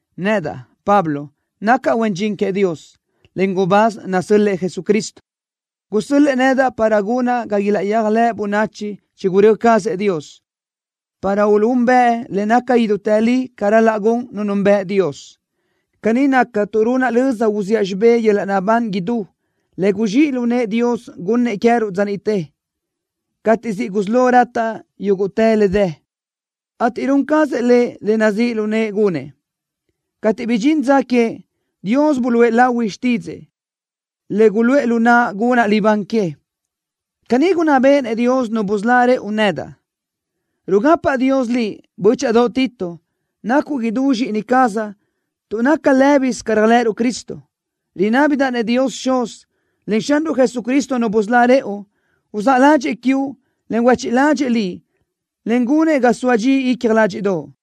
Nedaʼ, Pablo, nacaʼ huen dxin queëʼ Dios, en gubáz nasö́l-lëʼë Jesucristo. Gusö́l-lëʼë nedaʼ para gunaʼ ga ilaʼyéajlëʼ bönachi chigurö́ cazëʼ Dios, para uluʼúnbëʼ le naca idútë li ca ral-laʼ gun nu nunbëʼ Dios. Caní nacaʼ tuʼ runaʼ löza uziʼa xibé yöl-laʼ naʼbán idú le guzxíʼ lu nëʼë Dios gunnëʼ queë́ruʼ dza niʼte, cateʼ siʼ gusí lo rataʼ yúguʼtë le dë, ateʼ run cazëʼ Lëʼ le nazíʼ lu nëʼë gunëʼ. Cateʼ bidxín dza que, Dios buluʼe lahui xtídzëʼë, le guluʼë lu naʼa gunaʼ libán que. Caní gunná béʼenëʼ Dios, Nu busölá rëʼu, nedaʼ. Rugapaʼ Dios liʼ, bö́chaʼadoʼ Tito. Nacuʼ idú zxíʼini cazaʼ tuʼ naca lë́bisö ca réajlëʼëruʼ Cristo. Rinábidaʼ-nëʼ Dios Xuz, en Xanruʼ Jesucristo Nu busölá rëʼu, uzáʼ ládxëʼë quiuʼ, en huéchiʼ ládxëʼë liʼ, en gunëʼ ga soa dxi icja ládxiʼdoʼo.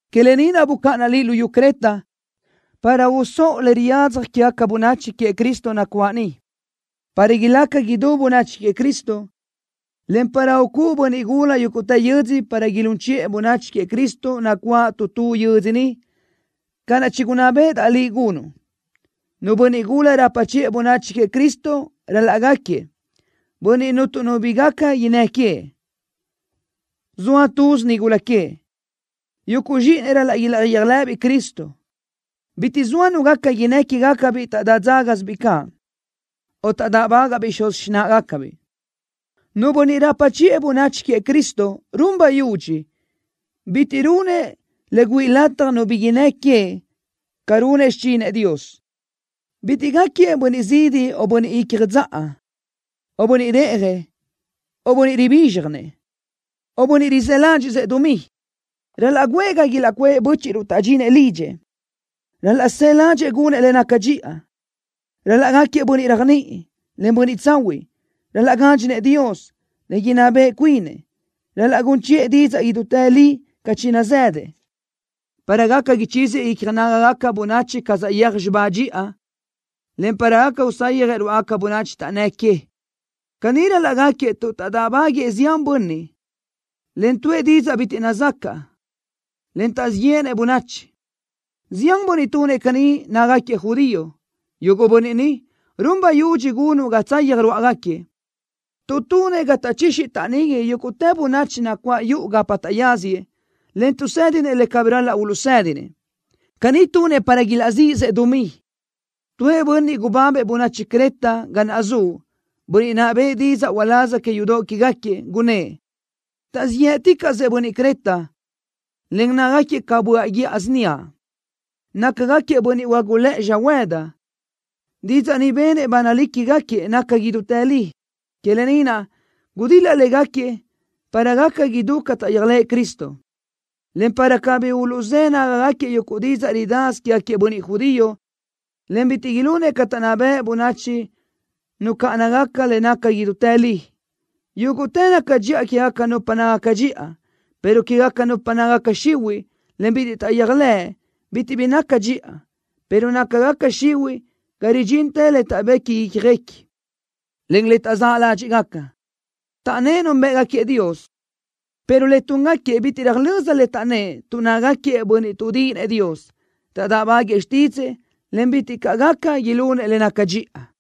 Que lë ni naʼ bucáʼanaʼ liʼ luyú Creta, para usóʼo le riyadzaj quégaca bönachi queëʼ Cristo nacuáʼ niʼ, para ilácagaca idú bönachi queëʼ Cristo, en para ucúʼu bönniʼ gula yúguʼtë yödzö para ilún chiʼë bönachi queëʼ Cristo nacuáʼ tu tu yödzö niʼ, ca naʼ chigunná béʼedaʼ liʼ gunuʼ. Nu bönniʼ gula rapa chiʼë bönachi queëʼ Cristo ral-laʼ gáquiëʼ: Bönniʼ cuntu nu bi gaca innë́ queëʼ. Zoa túzinu nigula queëʼ. Yuguʼ zxíʼinëʼ ral-laʼ ilaʼyéajlëʼëbiʼ Cristo. Bitiʼ soa nu gaca innë́ quégacabiʼ taʼdá dzágasibiʼ caʼ, o taʼdáʼbagaʼbiʼ xuz xináʼagacabiʼ. Nu bönniʼ rapa chiʼë bönachi queëʼ Cristo run bayudxi: Bitiʼ runëʼ le güíʼi lataj nu bi innë́ queëʼ ca runëʼ xichinëʼ Dios. Bitiʼ gáquiëʼ bönniʼ zidi o bönniʼ icja dzaʼa, o bönniʼ reʼjëʼ, o bönniʼ ribízxjanëʼ, o bönniʼ rizë́ ládxiʼsëʼ dumí. Ral-laʼ guʼë ga ilaʼcuʼë bö́chiʼruʼ taʼdxinëʼ lidxëʼ. Ral-laʼ së ládxëʼë gunëʼ le naca dxiʼa. Ral-laʼ gáquiëʼ bönniʼ réajniʼi, en bönniʼ tsahuiʼ. Ral-laʼ gádxinëʼ Dios, en inná beʼe cuinëʼ. Ral-laʼ gun chiʼë didzaʼ idútë li ca chinazëdëʼ, para gaca ichíziëʼ icja nágagaca bönachi ca saʼyéaj xibá dxiʼa, en para gaca usayjëʼ rúʼagaca bönachi taʼnnë́ que. Caní ral-laʼ gáquiëʼ tuʼ taʼdáʼbaguëʼë zián bönniʼ, en tuʼë didzaʼ bitiʼ nazacaʼ, en taʼzíʼ yéʼenëʼ bönachi. Zián bönniʼ tunëʼ caní nácagaquiëʼ judío. Yuguʼ bönniʼ ni, run bayudxi gunuʼ ga tsayaj ruáʼagaquiëʼ, tuʼ tunëʼ ga taʼchixi taʼnigui yúguʼtë bönachi nacuáʼ yuʼu gapa taʼyáziëʼ, en tuʼsédinëʼ le cabí ral-laʼ uluʼsédinëʼ. Caní tunëʼ para ilaʼzíʼisëʼ dumí. Tuëʼ bönniʼ gubábëʼ bönachi Creta ga naʼ zuʼ, bönniʼ naʼ bëʼë didzaʼ uláz que yudoʼ quégaquiëʼ, gunnë́ʼ: “Taʼzíʼ yë́ʼticaʼsëʼ bönniʼ Creta, en nácagaquiëʼ ca böaʼ guíʼa síniaʼ. Nácagaquiëʼ bönniʼ huágulëʼë xöhuëdi.” Didzaʼ ni benëʼ ba nalí quégaquiëʼ naca idútë li. Que lë ni naʼ gudil-la légaquiëʼ para gaca idú ca taʼyéajlëʼë Cristo, en para cabí uluʼzë́ nágagaquiëʼ yuguʼ didzaʼ ridasö quégaquiëʼ bönniʼ judío, en bitiʼ ilunëʼ ca taʼnná bëʼ bönachi nucáʼanagaca le naca idútë li. Yúguʼtë naca dxiʼa quégaca nupa nácagaca dxiʼa, pero quégaca nupa nácagaca xihuiʼ, en bitiʼ taʼyéajlëʼ, bitiʼ bi naca dxiʼa, pero nácagaca xihuiʼ ga ridxintë le taʼbequi ícjaguequi, en le taʼzáʼ ládxiʼgaca. Taʼnnë́ʼ núnbëʼgaquiëʼ Dios, pero le túngaquiëʼ bitiʼ röjlö́z le taʼnnë́ʼ tuʼ nácagaquiëʼ bönniʼ tuʼdíʼinëʼ Dios. Taʼdáʼbaguëʼë xtídzëʼë, en bitiʼ caʼ gaca ilunëʼ le naca dxiʼa.